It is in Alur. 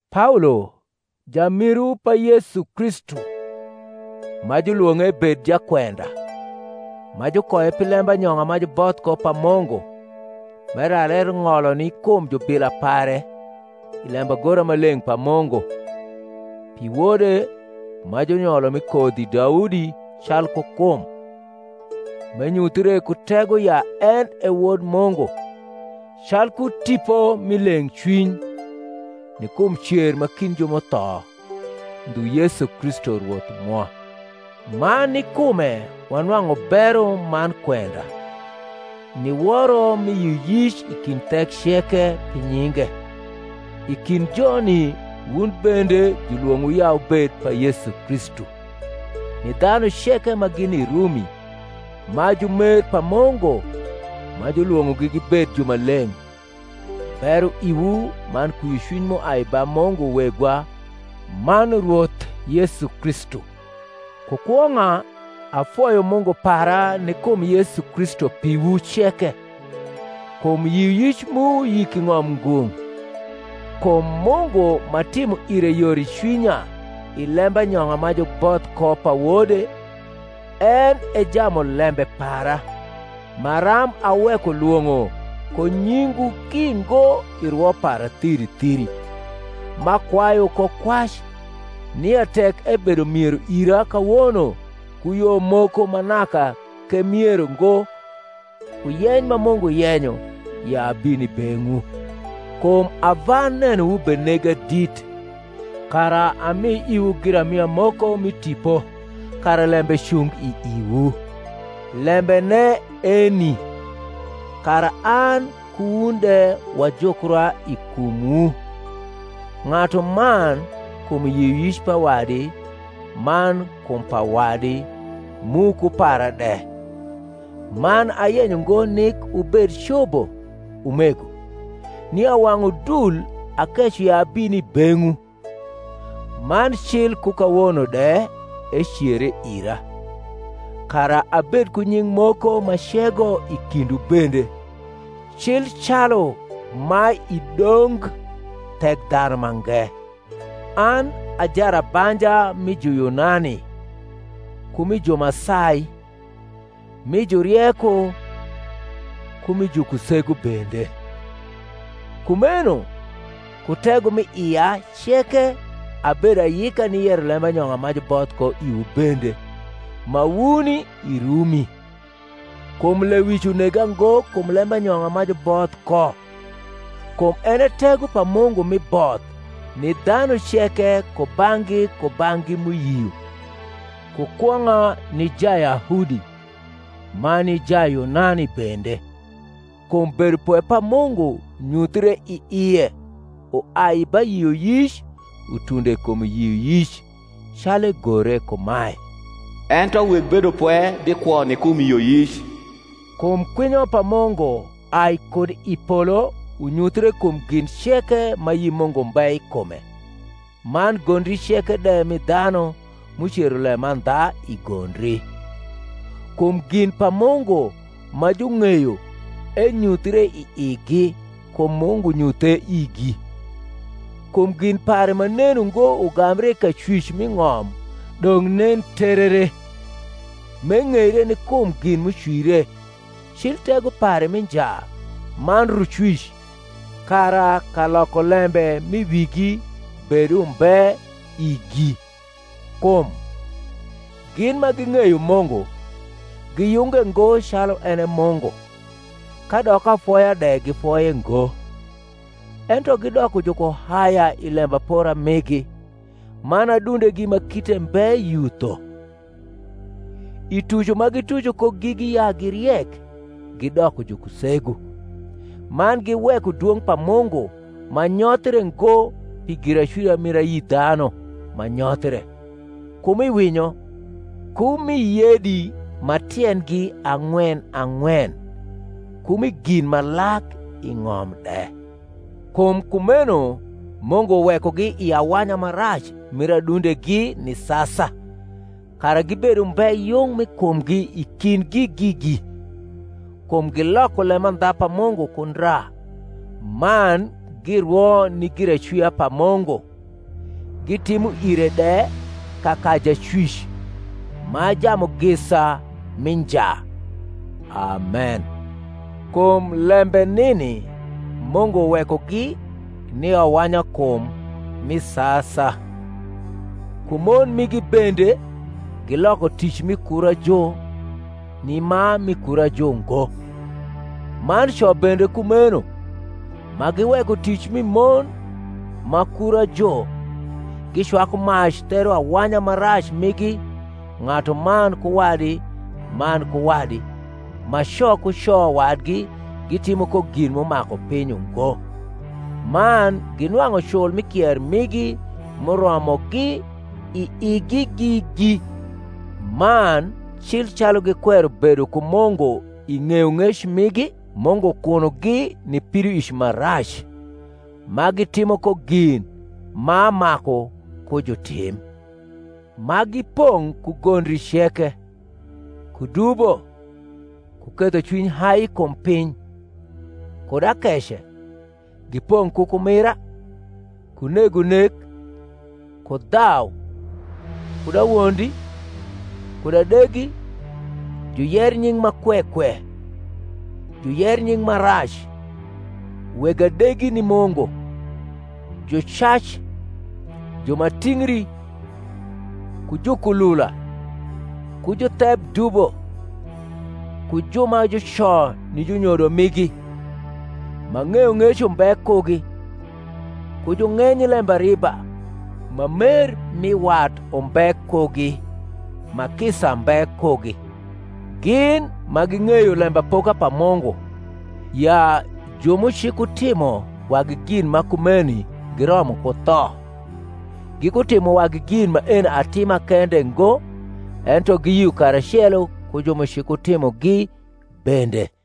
Paolo, jamiru pa Yesu Kristu, ma julwong’e ebed jakwenda, ma jukoye pi lembanyong’a ma juboth ko pa Mungu, m’elar eng’olo ni kum jubila pare i lembagora ma leng’ pa Mungu, pi Wode, ma junyolo mi kodhi Daudi calku kum, m’enyuthre ku tego ya en e Wod Mungu, calku tipo mi leng’cwiny, ni kum cer ma kind ju m’utho; ndhu Yesu Kristu Rwoth mwa, ma ni kume wanwang’u bero man kwenda, ni woro mi yioyic i kind thek ceke, pi nyinge; i kind joni wun bende, julwong’owu ya wubed pa Yesu Kristu: ni dhanu ceke ma gini i Rumi, ma jumer pa Mungu, ma julwong’ogi gibed jumaleng’: Bero iwu man kwiocwiny m’uai ba Mungu Wegwa man Rwoth Yesu Kristu. Ku kwong’a, afoyo Mungu para ni kum Yesu Kristu piwu ceke, kum yioyic mu yik i ng’om ngung’. Kum Mungu m’atimo ire yor i cwinya i lembanyong’a ma juboth ko pa Wode, en e jamulembe para, maram aweko lwong’o ko nyingwu ki ngo i rwo para thiri thiri m’akwayu ko kwac, nia tek ebedo miero ira kawono ku yo moko ma naka k’emiero ngo ku yeny ma Mungu yenyo ya abin i beng’wu. Kum ava nenowu benega dit, kara ami iwu giramia moko mi tipo, kara lembe cung i iwu; lembene eni, kara an ku wun de wajukra i kumwu, ng’atuman kum yioyic pa wadi man kum pa wadi, mu ku para de. Man ayenyo ngo nik wubed cobo, umego, nia wang’ udul akeco ya abin i beng’wu (man cil ku kawono de ecere ira), kara abed ku nying’ moko m’acego i kindwu bende, cil calu ma i dong Thekdhanumange. An a jarabanja mi Juyunani ku mi ju ma sai, mi jurieko ku mi jukusegu bende. Kumeno, ku tego m’i ia ceke, abedo ayika ni yero lembanyong’a ma juboth ko iwu bende ma wuni i Rumi. Kum lewic unega ngo kum lembanyong’a ma juboth ko: kum en e tego pa Mungu mi both ni dhanu ceke kubang’gi kubang’gi m’uyio; ku kwong’a ni Jayahudi, man ni Jayunani bende. Kum bedopwe pa Mungu nyuthre i ie uai ba yioyic utundo kum yioyic; calu egore kumae, Ento weg bedopwe bikwo ni kum yioyic. Kum kwinyo pa Mungu ai kud i polo unyuthre kum gin ceke ma ayi Mungu mbe i kume man gondri ceke de mi dhanu, m’ucero lemandha i gondri; kum gin pa Mungu ma jung’eyo enyuthre i igi; kum Mungu nyuthe igi. Kum gin pare ma nen ungo ugambre i kacwic mi ng’om dong’ nen terere, m’eng’eire ni kum gin m’ucwire, cil tego pare mi nja man rucwic; kara kalokolembe m’i wigi bed umbe igi: kum, gin ma ging’eyo Mungu, giyunge ngo calu en e Mungu, kadok afoya de gifoye ngo; ento gidoko jukuhaya i lembapora migi, man adundegi ma kite mbe yutho. I tuco ma gituco ko gigi ya gi riek, gidoko jukusegu, man giweko dwong’ pa Mungu ma nyothie ngo pi giracwia mir ayi dhanu ma nyothre, ku mi winyo, ku mi yedi ma tiendgi ang’wen ang’wen, ku mi gin ma lak i ng’om de. Kum kumeno Mungu wekogi i awanya ma rac mir adundegi ni sasa, kara gibed umbe yung mi kumgi i kindgi gigi: kum giloko lemandha pa Mungu ku ndra, man girwo ni giracwia pa Mungu gitimo ire de kaka Jacwic, ma Jamugisa mi nja. Amen. Kum lembe nini Mungu wekogi ni awanyakum mi sasa: kum mon migi bende giloko tic mi kurajo ni ma mi kurajo ngo: man co bende kumeno, ma giweko tic mi mon ma kurajo, gicwaku mac ther awanya ma rac migi ng’atuman ku wadi man ku wadi, ma co ku co wadi gitimo ko gin m’umaku piny ungo, man ginwang’u cul mi kier migi m’uromogi i igi gigi. Man cil calu gikwero bedo ku Mu.. ngu i ng’eyong’ec migi, Mungu kunogi ni pidoic ma rac, ma gitimo ko gin ma maku ku jutim; ma gipong’ ku gondri ceke, ku dubo, ku ketho cwiny hai kum piny, kud akece; gipong’ ku kumira, ku nego nek, ku dhau, kud awondi, kud adegi; juyer nying’ ma kwe kwe, juyer nying’ ma rac, weg adegi ni Mungu, jucac, ju ma tingri, ku jukulula, ku jutheb dubo, ku ju ma juco ni junyodo migi, ma ng’eyong’ec umbe kugi, ku jung’eny lembariba, ma mer mi wat umbe kugi, ma kisa mbe kugi: gin, ma ging’eyo lembapoka pa Mungu, ya ju m’ucikutimo wagi gin ma kumeni giromo ku tho, gikutimo wagi gin maeni atima kende ngo, ento giyio karacelo ku ju m’ucikutimogi bende.